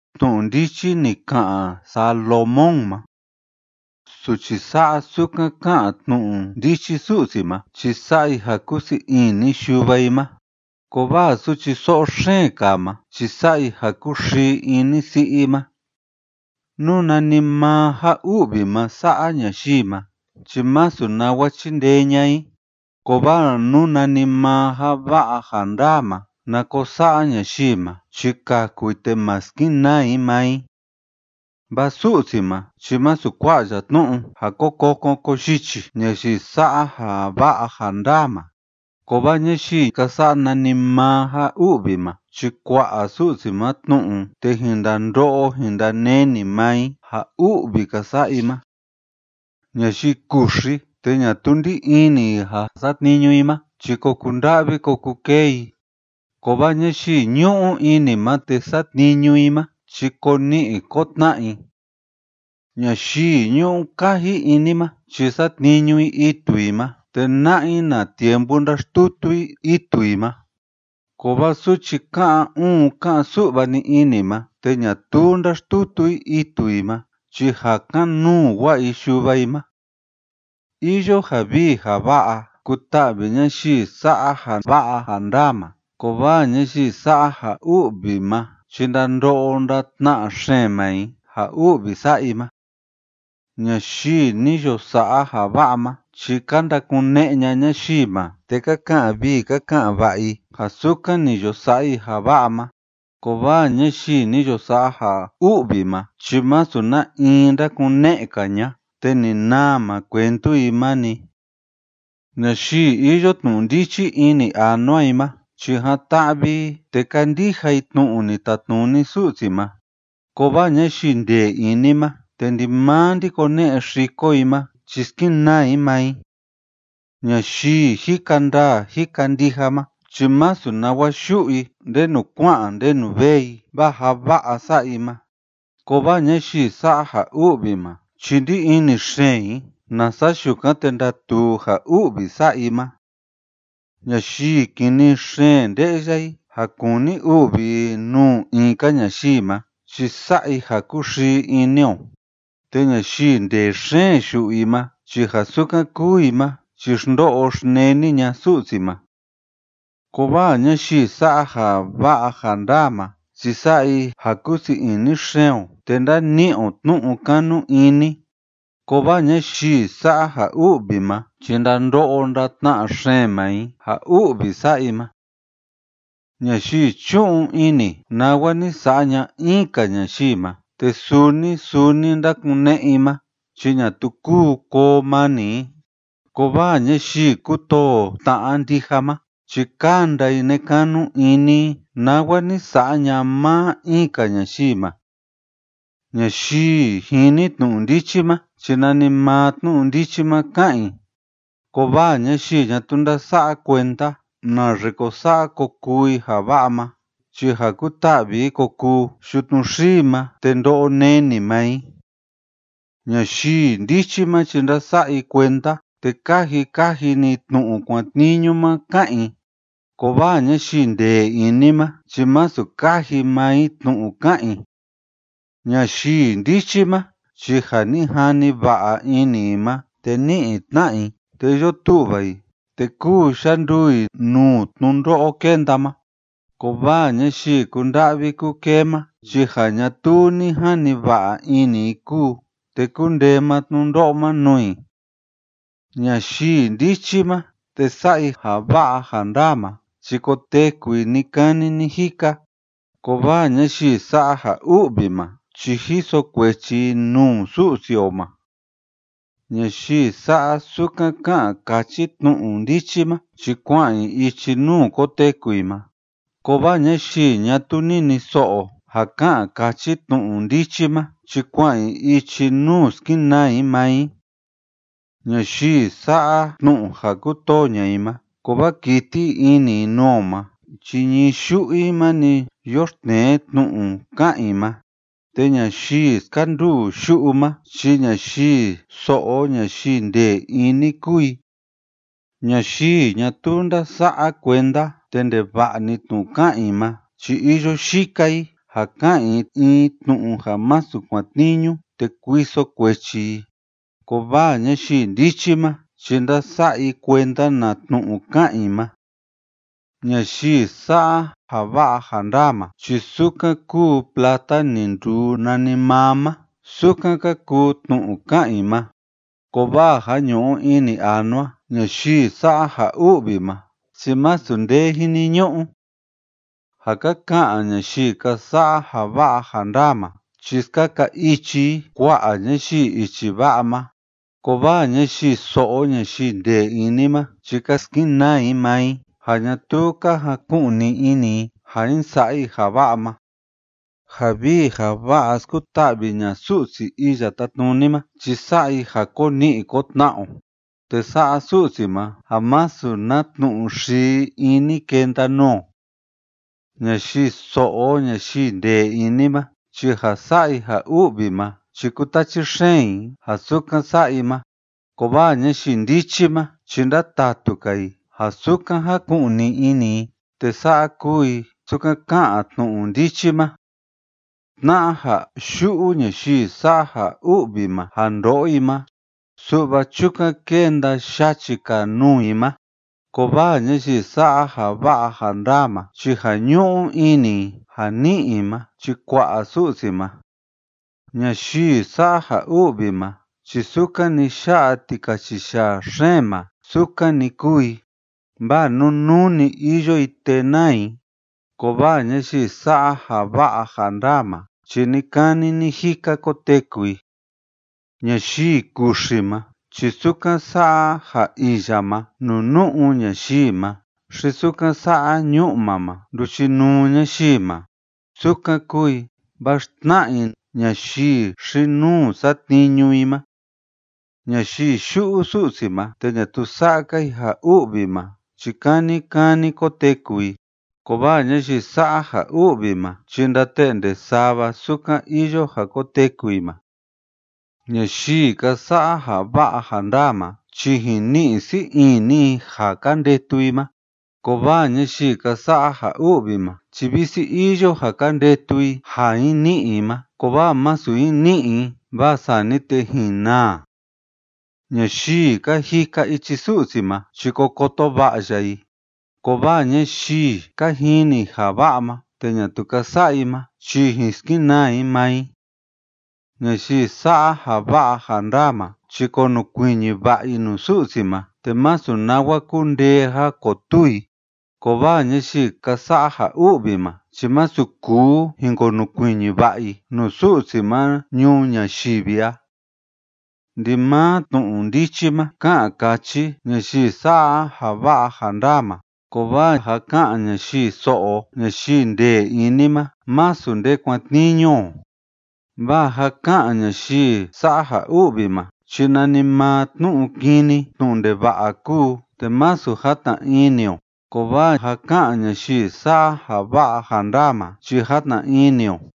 Tnu'u ndichi ni ka'an Salomón ma. Suchi sa'a sukan ká'an tnu'u ndichi Su'si ma chi sa'a i ja kúsii ini yuva i ma, kovaa suchi so'o xeen kaa ma chi sa'a i ja kúxii ini si'i i ma. Nú nanimaa ja u'vi ma sa'a ñayii ma chi masu nawa chíndee ña'a i, kovaa nú nanimaa ja va'a ja ndaa ma na ko sa'a ñayii ma chi kaku i te ma skenaa i maa i. Vaa Su'si ma chi masu kua'a ya tnu'u ja ko kokon ko yichi ñayii sa'a ja va'a ja ndaa ma, kovaa ñayii ka sa'a nanimaa ja u'vi ma chi kua'a Su'si ma tnu'u, te jin ndando'o jin ndaneni maa i ja u'vi ka sa'a i ma. Ñayii kuxi te ñatuu ndí ini i ja satniñu i ma chi ko kunda'vi ko kukee i, kovaa ñayii ñu'u ini ma te satniñu i ma chi ko ni'i ko tna'a i. Ñayii ñu'u kaji ini ma chi satniñu i itu i ma, te na'a i na tiempu ndáxtutu i itu i ma, kovaa suchi ká'an uun ká'an su'va‑ni ini ma te ñatuu ndáxtutu i itu i ma chi ja kan‑nuu wa'a i yuva i ma. Iyo ja vii ja va'a kuta'vi ñayii sa'a ja va'a ja ndaa ma, kovaa ñayii sa'a ja u'vi ma chi ndando'o ndatna'a xeen maa i ja u'vi sa'a i ma. Ñayii ni yo sa'a ja va'a ma chi ka ndakune'e ña'a ñayii ma, te ka ka'an vii ka ka'an va'a i ja sukan ni yo sa'a i ja va'a ma, kovaa ñayii ni yo sa'a ja u'vi ma chi masu na in ndakune'e‑ka ña'a te ni naa maa cuentu i ma‑ni. Ñayii iyo tnu'u ndichi ini anua i ma chi jan‑ta'vi i te kándija i tnu'u ni tatnuni Su'si ma, kovaa ñayii ndee ini ma te ndimaa ndákone'e xiko i ma chi skenaa i maa i. Ñayii jika ndaa jika ndija ma chi masu nawa yu'u i ndenu kua'an ndenu vee i vaa ja va'a sa'a i ma, kovaa ñayii sa'a ja u'vi ma chi ndí ini xeen i nasa yukan te ndatuu ja u'vi sa'a i ma. Ñayii kini xeen nde'ya i ja kúni u'vi i nuu in‑ka ñayii ma chi sa'a i ja kúxii ini o, te ñayii ndee xeen yu'u i ma chi ja sukan kúu i ma chi xndo'o xneni ña'a Su'si ma. Kovaa ñayii sa'a ja va'a ja ndaa ma chi sa'a i ja kúu sii ini xeen o te ndáni'i o tnu'u kanu ini, kovaa ñayii sa'a ja u'vi ma chi ndando'o ndatna'a xeen maa i ja u'vi sa'a i ma. Ñayii chú'un ini nawa ni sa'a ña'a in‑ka ñayii ma te suu‑ni suu‑ni ndákune'e i ma chi ñatuu kúu koo mani i, kovaa ñayii kútoo tna'a ndija ma chi kánda i nekanu ini i nawa ni sa'a ña'a maa in‑ka ñayii ma. Ñayii jini tnu'u ndichi ma chi nanimaa tnu'u ndichi ma ká'an i, kovaa ñayii ñatuu ndása'a kuenda naxe ko sa'a ko kuu i ja va'a ma, chi ja kuta'vi i ko kuu yutnu xii ma te ndo'o neni maa i. Ñayii ndichi ma chi ndása'a i kuenda te káji kaji‑ni i tnu'u kuatniñu ma ká'an i, kovaa ñayii ndee ini ma chi masu káji maa i tnu'u ká'an i. Ñayii ndichi ma chi ja ni jani va'a ini i ma te ní'i tna'a i te iyo tu'va i te kúu yanduu i nuu tnundo'o kénda ma, kovaa ñayii kúnda'vi kúkee ma chi ja ñatuu ni jani va'a ini i kúu, te kundee maa tnundo'o ma nuu i. Ñayii ndichi ma te sa'a i ja va'a ja ndaa ma chi koteku i ni‑kani ni‑jika, kovaa ñayii sa'a ja u'vi ma chi jiso kuechi i nuu Su'si o ma. Ñayii sa'a sukan ká'an káchi tnu'u ndichi ma chi kua'an i ichi nuu koteku i ma, kovaa ñayii ñatuu niniso'o ja ká'an káchi tnu'u ndichi ma chi kua'an i ichi nuu skenaa i maa i. Ñayii sa'a tnu'u ja kútoo ña'a i ma kovaa kíti ini i nuu o ma chi ñii yu'u i ma‑ni yoxtnee tnu'u ká'an i ma. Te ñayii skanduu yu'u ma chi ñayii so'o ñayii ndee ini kúu i. Ñayii ñatuu ndása'a kuenda te ndeva'a‑ni tnu'u ká'an i ma chi iyo yika i ja ka'an i in tnu'u ja masu kuatniñu te kuiso kuechi i, kovaa ñayii ndichi ma chi ndása'a i kuenda na tnu'u ká'an i ma. Ñayii sa'a ja va'a ja ndaa ma chi sukan kúu plata ni nduu nanimaa ma, sukan ka kuu tnu'u ká'an i ma, kovaa ja ñu'u ini anua ñayii sa'a ja u'vi ma chi masu nde jiniñu'u. Ja ka ka'an ñayii ka sa'a ja va'a ja ndaa ma chi skaka ichi i kua'a ñayii ichi va'a ma, kovaa ñayii so'o ñayii ndee ini ma chi ka skenaa i maa i ja ñatuu ka jaku'ni ini i ja jin sa'a i ja va'a ma. Ja vii ja va'a skuta'vi ña'a Su'si Iya Tátnuni ma chi sa'a i ja ko ni'i ko tna'a o, te sa'a Su'si ma ja masu na tnu'u xii ini kenda nuu o. Ñayii so'o ñayii ndee ini ma chi ja sa'a i ja u'vi ma chi kútachi xeen i ja sukan sa'a i ma, kovaa ñayii ndichi ma chi ndátatu‑ka i ja sukan jáku'ni ini i te sa'a kúu i sukan ká'an tnu'u ndichi ma. Tna'a ja yu'u ñayii sa'a ja u'vi ma ja ndo'o i ma, su'va chukan kenda yachi‑ka nuu i ma, kovaa ñayii sa'a ja va'a ja ndaa ma chi ja ñu'u ini i ja ni'i i ma chi kua'a Su'si ma. Ñayii sa'a ja u'vi ma chi sukan‑ni yá'a tikachiyaa xeen ma sukan‑ni kúu i, vaa nunuu‑ni iyo i te náa i, kovaa ñayii sa'a ja va'a ja ndaa ma chi ni‑kani ni‑jika koteku i. Ñayii kuxi ma chi sukan sa'a ja iya ma nuu nu'u ñayii ma xi sukan sa'a ñu'ma ma nduchinuu ñayii ma, sukan kúu i, vaa xtna'a i ñayii xi‑nuu satniñu i ma. Ñayii yu'u Su'si ma te ñatuu sa'a‑ka i ja u'vi ma chi kani kani koteku i, kovaa ñayii sa'a ja u'vi ma chi ndate'nde sava sukan iyo ja koteku i ma. Ñayii ka sa'a ja va'a ja ndaa ma chi jin ni'i sii ini i ja ka ndetu i ma, kovaa ñayii ka sa'a ja u'vi ma chi visi iyo ja ka ndetu i ja jin ni'i i ma, kovaa masu jin ni'i i, vaa sani te jin naa. Ñayii ka jika ichi Su'si ma chi ko koto va'a ya i, kovaa ñayii ka jini ja va'a ma te ñatuu ka sa'a i ma chi jin skenaa i maa i. Ñayii sa'a ja va'a ja ndaa ma chi konukuiñi va'a i nuu Su'si ma te masu nawa kundee ja kotuu i, kovaa ñayii ka sa'a ja u'vi ma chi masu kuu jin konukuiñi va'a i nuu Su'si ma ñuu ñayivi a. Ndimaa tnu'u ndichi ká'an káchi ñayii sa'a ja va'a ja ndaa ma, kovaa ja ká'an ñayii so'o ñayii ndee ini ma masu nde kuatniñu o. Vaa ja ká'an ñayii sa'a ja u'vi ma chi nanimaa tnu'u kini tnu'u ndeva'a kúu, te masu játna ini o, kovaa ja ká'an ñayii sa'a ja va'a ja ndaa ma chi játna ini o.